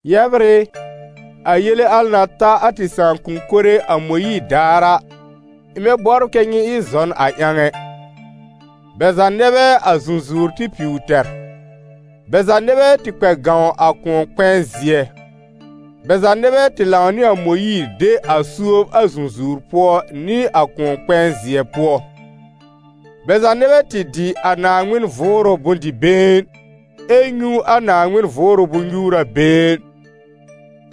Yɛbr ɩ, a yele na ta a tɩ sãakʋm mɩnɛ a Mõyiir daar a, ɩ̃ bɛ bɔbr kɛ́ nyɩ ɩ zɔn a ƴãw ɛ. Bɛ za nɛ bɛ a zũzũwr tɩ piw tɛr, bɛ za nɛ bɛ tɩ kpɛ gãw a Kʋ̃ɔ-kpɛ̃ɛ-zɩɛ. Bɛ za nɛ bɛ tɩ lãw nɩ a Mõyiir de a suob a zũzũwr pʋɔ nɩ a Kʋ̃ɔ-kpɛ̃ɛ-zɩɛ pʋɔ. Bɛ za nɛ bɛ tɩ dɩ a Naaŋmɩn Vʋʋrʋ bʋ̃-dɩ-been, ɛ nyũ a Naaŋmɩn Vʋʋrʋ bʋ̃-nyuura-been: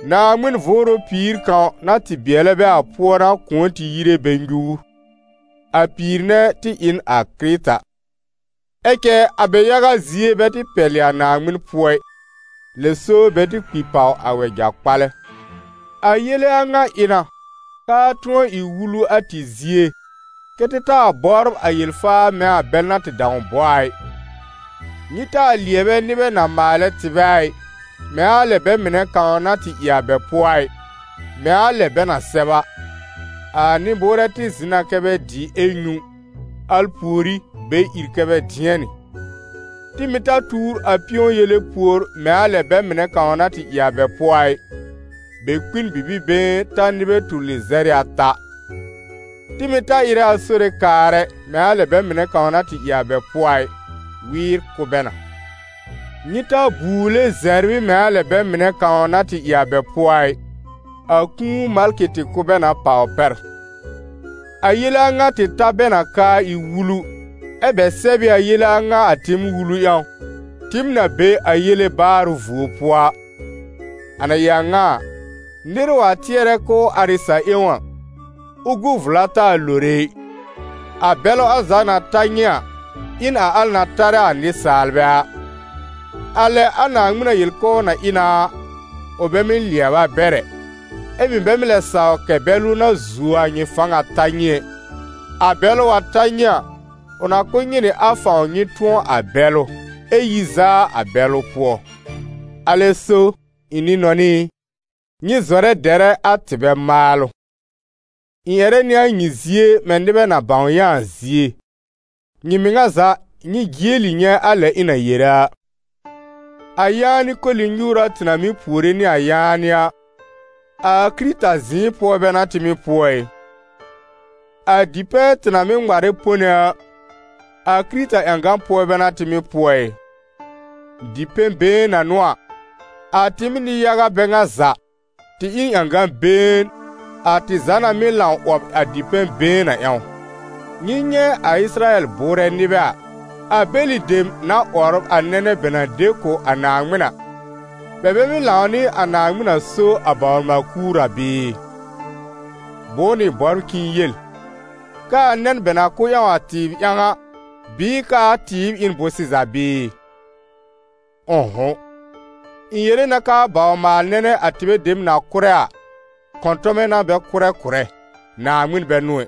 Naaŋmɩn Vʋʋrʋ pìir kãw, na tɩ bɩɛlɛ bɛ a pʋɔ n'a kʋ̃ɔ tɩ yire bɛ nyuur: a pìir nɛ tɩ ɩ n a Kɩrɩta. Ɛ cɛ a bɛ yaga zie bɛ tɩ pɛlɩ a Naaŋmɩn pʋɔ ɩ, lɛ so bɛ tɩ kpi pàw a wɛja-kpalɛ. A yele a ŋa ɩ na, k'aa tʋ̃ɔ ɩ wulu a tɩ zie, kɛ́ tɩ taa bɔbr a yel-faa mɛ̃ a bɛl na tɩ dãw bɔ a ɩ. Nyɩ taa lɩɛbɛ nɩbɛ na maalɛ tɩbɛ a ɩ, mɛ̃ a lɛ bɛ mɩnɛ kãw na tɩ ɩ a bɛ pʋɔ a ɩ, mɛ̃ a lɛ bɛ na sɛb a: «A nɩ-bʋʋrɛ tɩ zɩ̃ na kɛ́ bɛ dɩ ɛ nyũ, al pùorí bɛ ìr kɛ́ bɛ dɩɛnɩ.» Tɩ mɩ̀ ta tuur a pɩ̃ɔ-yele pùor mɛ̃ a lɛ a bɛ mɩnɛ kãw na tɩ ɩ a bɛ pʋɔ a ɩ: bɛ kpi n bibi-been ta nɩbɛ tur lɩzɛr nɩ ata. Tɩ mɩ̀ ta ɩrɛ a Sore kaar ɛ, mɛ̃ a lɛ a bɛ mɩnɛ kãw na tɩ ɩ a bɛ pʋɔ a ɩ: wɩɩr kʋ́ bɛ na. Nyɩ ta buule zɛbr ɩ mɛ̃ a lɛ a bɛ mɩnɛ kãw na tɩ ɩ a bɛ pʋɔ a ɩ: a kũu malkɩ tɩ kʋ́ bɛ na pàw pɛr. A yele a ŋa tɩ ta bɛ na k'aa ɩ wulu, ɛ́ bɛ sɛb ɩ a yele a ŋa a tɩɩm wulu ƴãw, tɩɩm na be a yele baarʋ vuo pʋɔ a. A na ɩ a ŋa a, nɩr wa tɩɛrɛ k'ʋʋ ar ɩ sa-ƴẽwn a, ʋ gu vla taa lore ɩ. A bɛlʋ al za na ta nyɩ a, ɩ n a al na tarɛ a nɩsaalbɛ a. A lɛ a Naaŋmɩn na yel k'ʋʋ na ɩ na a, ʋ bɛ mɩ́ lɩɛb a bɛr ɛ, ɛ bɛ mɩ́ lɛ saw kɛ̀ bɛlʋ na zuo a nyɩ fãw a ta nyɩ ɛ. A bɛlʋ wa ta nyɩ a, ʋ na kʋ̀ nyɩ nɩ a fãw nyɩ tʋ̃ɔ a bɛlʋ, ɛ yi zaa a bɛlʋ pʋɔ. Alɛ so, ɩ̃ nɩ-nɔnɩ ɩ, nyɩ zɔrɛ dɛrɛ a tɩbɛ maalʋ. Ɩ̃ ƴɛrɛ nɩ a nyɩ zie mɛ̃ nɩbɛ na bãw yã a zie; nyɩ mɩŋa za nyɩ jieli nyɛ̃ a lɛ ɩ̃ na yere a. A yaanɩ koli-nyuura tɩ na mɩ́ puore nɩ a yaanɩ a, a Kɩrɩta zɩ̃ɩ pʋɔ bɛ n'a tɩ mɩ́ pʋɔ ɩ? A dipɛ̃ tɩ na mɩ́ ŋmarɛ pone a, a Kɩrɩta ƴãgan pʋɔ bɛ n'a tɩ mɩ́ pʋɔ ɩ? Dipɛ̃-been na n'ʋ a, a tɩɩm nɩ-yaga bɛ ŋa za, tɩ ɩ n ƴãgã-been, a tɩ za na mɩ́ lãw 'wɔb a dipɛ̃-been a ƴãw. Nyɩ nyɛ̃ a Ɩsɩrayɛl bʋʋrɛ nɩbɛ a: a bɛlɩ dem na 'wɔbr a nɛnɛ bɛ na de kʋ̀ a Naaŋmɩn a, bɛ bɛ mɩ́ lãw nɩ a Naaŋmɩn na so a bawr-maal-kuur a bɩɩ? Bʋ̃ʋ n'ʋ ɩ̃ bɔbr k'ɩ̃ɩ yel? K'aa nɛn bɛ na kʋ́ ƴãw a tɩɩb ƴãw a, bɩɩ k'aa tɩɩb ɩ n bʋ̃-sɩza bɩɩ? Ʋ̃ʋ'hʋ̃! Ɩ̃ yere na k'aa bawr-maal-nɛnɛ a tɩbɛ dem na kʋ́rɛ a, kɔ̃tɔmɛ n'a bɛ kʋ́rɛ kʋ̀rɛ, Naaŋmɩn bɛ n'ʋ ɛ.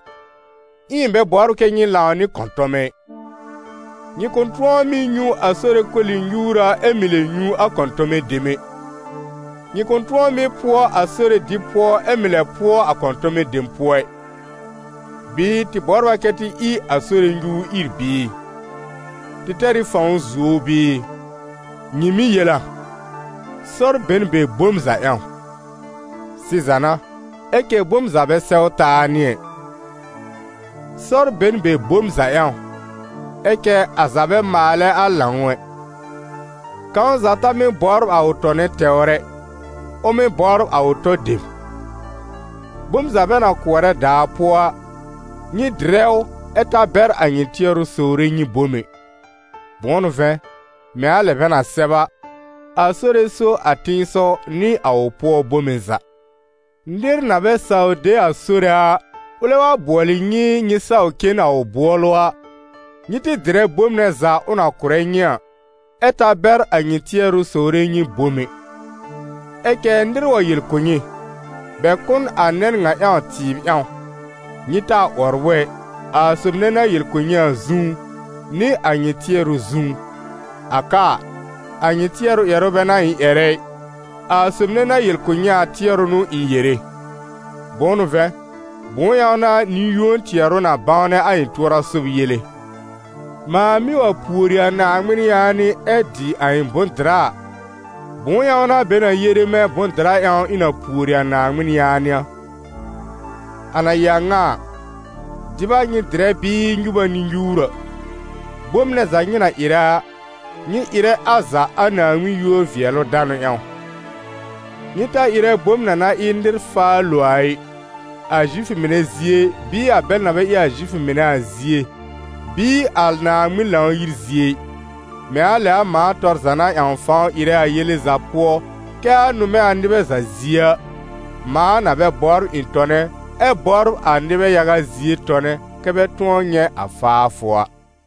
Ɛ ɩ̃ bɛ bɔbr kɛ nyɩ lãw nɩ kɔ̃tɔmɛ ɩ. Nyɩ kʋ̃ tʋ̃ɔ mɩ́ nyũ a Sore koli-nyuura ɛ mɩ̀ lɛ nyũ a kɔ̃tɔmɛ dem ɛ, nyɩ kʋ̃ tʋ̃ɔ mɩ́ pʋɔ a Sore dɩb pʋɔ ɛ mɩ̀ lɛ pʋɔ a kɔ̃tɔmɛ dem pʋɔ ɩ. Bɩɩ tɩ bɔbr a kɛ tɩ ɩ a Sore nyuur ìr bɩɩ? Tɩ tɛr ɩ fãw zuo ʋ bɩɩ? Nyɩ mɩ́ yel a: «Sɔr be n be bom za ƴãw». Sɩza n'a, ɛ cɛ bom za bɛ sɛw taa nɩ ɛ! «Sɔr be n be bom za ƴãw», ɛ cɛ a za bɛ maalɛ a lãw ɛ. Kãw za ta mɩ́ bɔbr a ʋ tɔnɛ tɛwr ɛ, ʋ mɩ́ bɔbr a ʋ tɔ dem. Bom za bɛ na kʋɔrɛ daa pʋɔ a, nyɩ dɩrɛ ʋ ɛ ta bɛr a nyɩ tɩɛrʋ sowre nyɩ bom ɛ. Bʋ̃ʋ n'ʋ vɛ̃, mɛ̃ a lɛ bɛ na sɛb a: «A Sore so a tẽsɔw nɩ a ʋ pʋɔ bome za.» Nɩr na bɛ saw de a Sore a, ʋlɛ wa bʋɔlɩ nyɩ nyɩ saw cen a ʋ bʋɔlʋ a, nyɩ tɩ dɩrɛ bom nɛ za ʋ na kʋ̀rɛ nyɩ a, ɛ ta bɛr a nyɩ tɩɛrʋ sowre nyɩ bom ɛ. Ɛ cɛ nɩr wa yel kʋ̀ nyɩ: «Bɛ kʋ̀ n a nɛn ŋa ƴãw tɩɩb ƴãw», nyɩ taa 'wɔbr ʋ ɛ, a sob nɛ na yel kʋ̀ nyɩ a zũú, nɩ a nyɩ tɩɛrʋ zũú. A ka a, a nyɩ tɩɛrʋ ƴɛrʋ bɛ n'a ɩ̃ ƴɛrɛ ɩ, a sob nɛ na yel kʋ̀ nyɩ a, tɩɛrʋ n'ʋ ɩ̃ yere. Bʋ̃ʋ n'ʋ vɛ̃, bʋ̃ʋ ƴãw n'a nɩ-yũo tɩɛrʋ na bãwnɛ a ɩ̃ tʋɔra sob yele? Mãa mɩ́ wa pùori a Naaŋmɩn yaanɩ ɛ dɩ a ɩ̃ bʋ̃-dɩra a, bʋ̃ʋ ƴãw n'a bɛ na yere mɛ̃ bʋ̃-dɩra ƴãw ɩ̃ na pùori a Naaŋmɩn yaanɩ a? A na ɩ a ŋa a, dɩb a nyɩ dɩrɛ bɩɩ nyub a nyɩ nyuur a, bom nɛ za nyɩ na ɩrɛ a, nyɩ ɩrɛ a za a Naaŋmɩn yúor-vɩɛlʋ-danʋ ƴãw. Nyɩ ta ɩrɛ bom na na ɩ nɩr faa lo a ɩ, a Zifʋ mɩnɛ zie bɩɩ a bɛl na bɛ ɩ Zifʋ mɩnɛ a zie bɩɩ a Naaŋmɩn Lãw-yir zie ɩ, mɛ̃ a lɛ a mãa tɔr za na ƴãw fãw ɩrɛ a yele za pʋɔ kɛ a nʋmɛ a nɩbɛ za zie a, mãa na bɛ bɔbr ɩ̃ tɔnɛ, ɛ bɔbr a nɩbɛ yaga zie tɔnɛ, kɛ́ bɛ tʋ̃ɔ nyɛ̃ a faafʋ a.